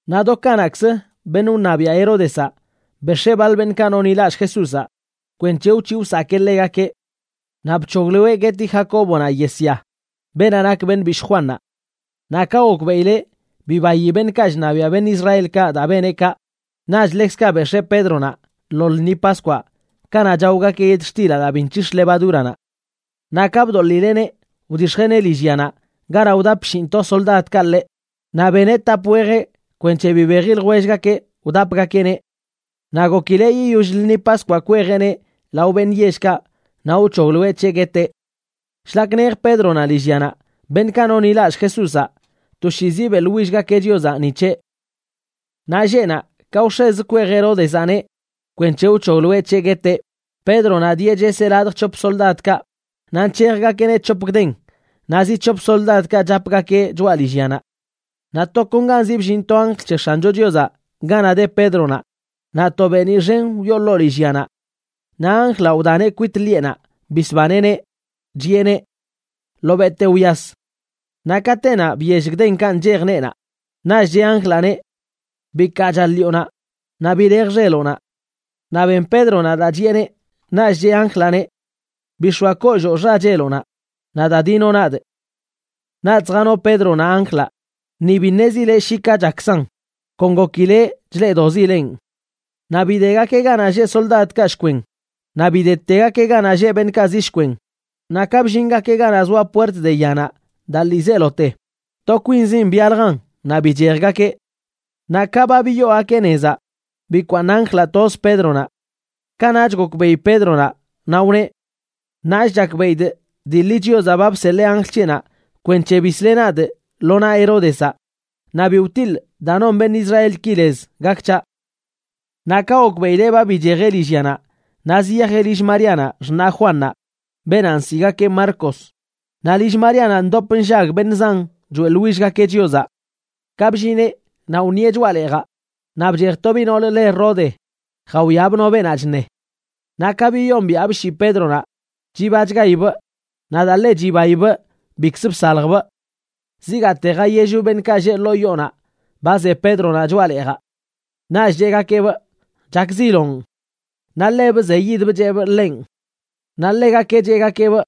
Naꞌ do kanaꞌkzə beṉꞌ wṉabiaꞌ Heródezaꞌ bex̱ee baḻ beṉꞌkaꞌ nonḻilallꞌ Jesúzaꞌ kwenc̱he wc̱hiꞌ wsakee ḻegakeꞌ. Naꞌ bc̱hogloeꞌ gueti Jacóbonaꞌ yesya, beenaꞌ nak beṉꞌ bishꞌ Juannaꞌ. Naꞌ ka gokbeꞌileꞌ bibayi beṉꞌkaꞌ chṉabiaꞌ beṉꞌ Israelkaꞌ daa beneꞌ kaꞌ, naꞌch ḻekzkaꞌ bex̱ee Pédronaꞌ lo lṉi Paskwaꞌ kanaꞌ chaogakeꞌ yetxtilaꞌ daa bi nc̱hix̱ levadúranaꞌ. Naꞌ ka bdoḻileꞌneꞌ, wdix̱jeꞌneꞌ lillyanaꞌ ganaꞌ wdap shinꞌto soldadkaꞌ ḻeꞌ, naꞌ beneꞌ tap wejeꞌ kwenc̱he bibeji ljwellgakeꞌ wdapgakeꞌneꞌ. Naꞌ gokileꞌ yiyoll lṉi Paskwaꞌ kwejeꞌneꞌ lao beṉꞌ yellkaꞌ naꞌ wc̱hogloeꞌ c̱heꞌ gueteꞌ. Shlak nej Pédronaꞌ lillyanaꞌ, beṉꞌkaꞌ nonḻilallꞌ Jesúzaꞌ toshiizi beꞌḻwillgakeꞌ Chiozaꞌ ni c̱heꞌ. Naꞌ lleꞌnaꞌ ka wx̱ezə kwej Heródezaꞌneꞌ kwenc̱he wc̱hogloeꞌ c̱heꞌ gueteꞌ, Pédronaꞌ dieꞌ cheseꞌ ladj c̱hop soldadkaꞌ, naꞌ nc̱hejgakeꞌneꞌ c̱hop gden, naꞌ zi c̱hop soldadkaꞌ chapgakeꞌ choꞌa lillyanaꞌ. Naꞌ tokonganzi bllin to anjl c̱he X̱ancho Chiozaꞌ ganaꞌ de Pédronaꞌ naꞌ to beeniꞌ xen wyoo ḻoo lillyanaꞌ. Naꞌ anjlaꞌ wdaneꞌ kwit ḻiꞌenaꞌ bisbaneꞌneꞌ, chiꞌeneꞌ: ―Ḻobeꞌte wyas. Naꞌ katenaꞌ biyell gdenkaꞌ nchej neenaꞌ. Naꞌch cheꞌ anjlaꞌneꞌ: ―Bikaacha ḻiꞌonaꞌ naꞌ bilej xeloꞌnaꞌ. Naꞌ ben Pédronaꞌ daa chiꞌeneꞌ, naꞌch cheꞌ anjlaꞌneꞌ: ―Bix̱oa kolloo xacheloꞌnaꞌ, naꞌ da dinoꞌ nadꞌ. Naꞌch zjano Pédronaꞌ anjlaꞌ, ni bi ṉezileꞌ shi ka chakkzan, kon gokileꞌ chleꞌdoꞌzilenꞌ. Naꞌ bidegakeꞌ ganaꞌ lleꞌ soldadkaꞌ shkwen, naꞌ bidetegakeꞌ ganaꞌ lleꞌ beṉꞌkaꞌ zi shkwen, naꞌ ka bllingakeꞌ ganaꞌ zoa puert de yanaꞌ daa ḻiizelote, to kwinzin byaljan naꞌ bichejgakeꞌ. Naꞌ ka ba biyoogakeꞌ nezaꞌ, bikwaaṉ anjlaꞌ toz Pédronaꞌ. Kanaꞌch gokbeꞌi Pédronaꞌ, naꞌ wneꞌ: ―Ṉaach chakbeꞌidꞌ dii ḻi Chiozaꞌ ba bseḻee anjl c̱heꞌnaꞌ kwenc̱he bisleꞌ nadꞌ lo naꞌ Heródezaꞌ, naꞌ bi wtiḻꞌ daa non beṉꞌ Israelki lez gak c̱haꞌ. Naꞌ ka gokbeꞌileꞌ ba bichejeꞌ lillyanaꞌ, naꞌ ziyajeꞌ lill Maríanaꞌ xṉaꞌ Juannaꞌ, beenaꞌ nsiꞌgakeꞌ Marcos. Naꞌ lill Maríanaꞌ ndop nllag beṉꞌ zan choeꞌḻwillgakeꞌ Chiozaꞌ. Ka bllineꞌ, naꞌ wṉieꞌ choꞌa leejaꞌ, naꞌ bchej to biꞌ noolə le Rode, jawiabꞌ no beenaꞌ chṉe. Naꞌ ka biyombiaꞌbꞌ shii Pédronaꞌ chibachgaibꞌ, naꞌ daa ḻe chibaibꞌ bikz bsaljbꞌ. Zigaate jayellbꞌ beṉꞌkaꞌ lleꞌ ḻoo yoonaꞌ ba ze Pédronaꞌ choꞌa leejaꞌ. Naꞌch cheꞌgakeꞌbꞌ: ―Chakziloꞌn. Naꞌ ḻebꞌ wzeyidbꞌ cheꞌbꞌ ḻenꞌ. Naꞌ ḻegakeꞌ cheꞌgakeꞌbꞌ: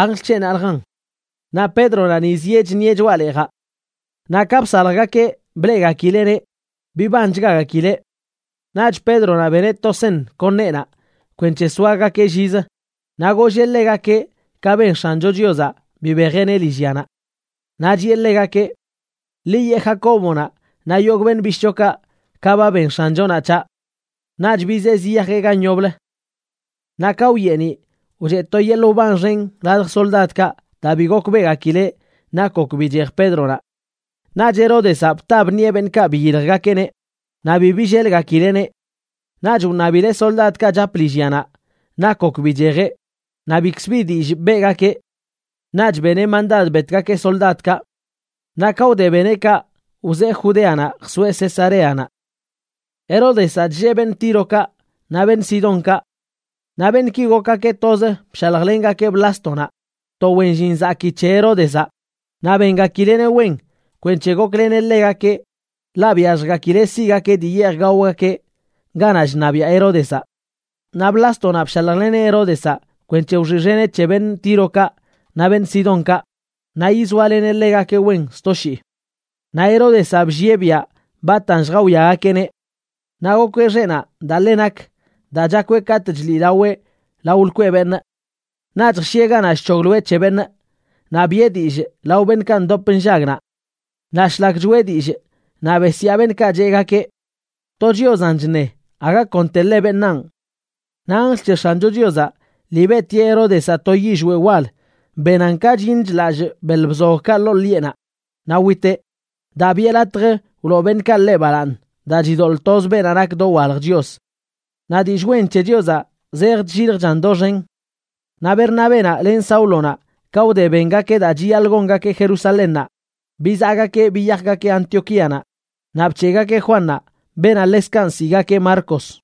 ―Anjl c̱heꞌnaꞌljan. Naꞌ Pédronaꞌ ni zieꞌ chṉieꞌ choꞌa leejaꞌ. Naꞌ ka bsaljgakeꞌ bleꞌgakileꞌneꞌ, bibanchgagakileꞌ. Naꞌch Pédronaꞌ beneꞌ to seṉ kon neenaꞌ kwenc̱he soagakeꞌ llizə, naꞌ golleꞌ ḻegakeꞌ ka ben X̱ancho Chiozaꞌ bibejeꞌneꞌ lillyanaꞌ. Naꞌ chiꞌe ḻegakeꞌ: ―Ḻi yeꞌ Jacóbonaꞌ naꞌ yogꞌ beṉꞌ bishꞌchokaꞌ ka ba ben X̱anchonaꞌ c̱haꞌ. Naꞌch bizee ziyajeꞌ gan yoblə. Naꞌ ka wyeeniꞌ, wcheꞌ to yeḻꞌ wban xen ladj soldadkaꞌ daa bi gokbeꞌgakileꞌ nak gok bichej Pédronaꞌ. Naꞌch Heródezaꞌ bta bṉieꞌ beṉꞌkaꞌ biyiljgakeꞌneꞌ, naꞌ bi billelgakileꞌneꞌ. Naꞌch wṉabileꞌ soldadkaꞌ chap lillyanaꞌ nak gok bichejeꞌ, naꞌ bikz bi dillꞌ beꞌgakeꞌ. Naꞌch beneꞌ mandad betgakeꞌ soldadkaꞌ. Naꞌ ka wde beneꞌ kaꞌ, wzee Judeanaꞌ jsoeꞌ Cesareanaꞌ. Heródezaꞌ chllee beṉꞌ Tírokaꞌ naꞌ beṉꞌ Sidónkaꞌ. Naꞌ beṉꞌki gokgakeꞌ toz bshaljlengakeꞌ Blástonaꞌ, to wen llin zakii c̱he Heródezaꞌ, naꞌ bengakileꞌneꞌ wen kwenc̱he gokleneꞌ ḻegakeꞌ, ḻaꞌ byalljgakileꞌ siꞌgakeꞌ dii yeej gaogakeꞌ ganaꞌ chṉabiaꞌ Heródezaꞌ. Naꞌ Blástonaꞌ bshaljleneꞌ Heródezaꞌ kwenc̱he wxiꞌxeneꞌ c̱he beṉꞌ Tírokaꞌ naꞌ beṉꞌ Sidónkaꞌ naꞌ yizoaleneꞌ ḻegakeꞌ wen sto shii. Naꞌ Heródezaꞌ bllieꞌ biaꞌ batan lljawiagakeꞌneꞌ. Naꞌ gokweꞌ xeꞌnaꞌ daa ḻe nak daa chakweꞌ katꞌ chliꞌlaweꞌ lao lkweꞌ beṉꞌ. Naꞌch jshieꞌ ganaꞌ chc̱hogloeꞌ c̱he beṉꞌ, naꞌ biꞌe dillꞌ lao beṉꞌkaꞌ ndop nllag naꞌ. Naꞌ shlak choꞌe dillꞌ, naꞌ besyaa beṉꞌkaꞌ cheꞌgakeꞌ: ―To chiozaꞌn chṉe, aga konteḻe beṉaan. Naꞌ anjl c̱he X̱ancho Chiozaꞌ lii beꞌtieꞌ Heródezaꞌ to yillweꞌ wal benan ka chyiṉ chḻallꞌ beḻ bzogꞌkaꞌ ḻoo ḻiꞌenaꞌ naꞌ witeꞌ, daa biꞌe latj wloo beṉꞌkaꞌ ḻeꞌ balaaṉ daa chidoḻꞌ toz beenaꞌ nak dowalj Chios. Naꞌ dillꞌ wen c̱he Chiozaꞌ zej chlliljchan doxen. Naꞌ Bernabénaꞌ len Sáulonaꞌ ka wde bengakeꞌ daa chiyaḻꞌ gongakeꞌ Jerusalénnaꞌ, bizaꞌgakeꞌ biyajgakeꞌ Antioquíanaꞌ, naꞌ bc̱heꞌgakeꞌ Juannaꞌ, beenaꞌ ḻekzkaꞌ nsiꞌgakeꞌ Marcos.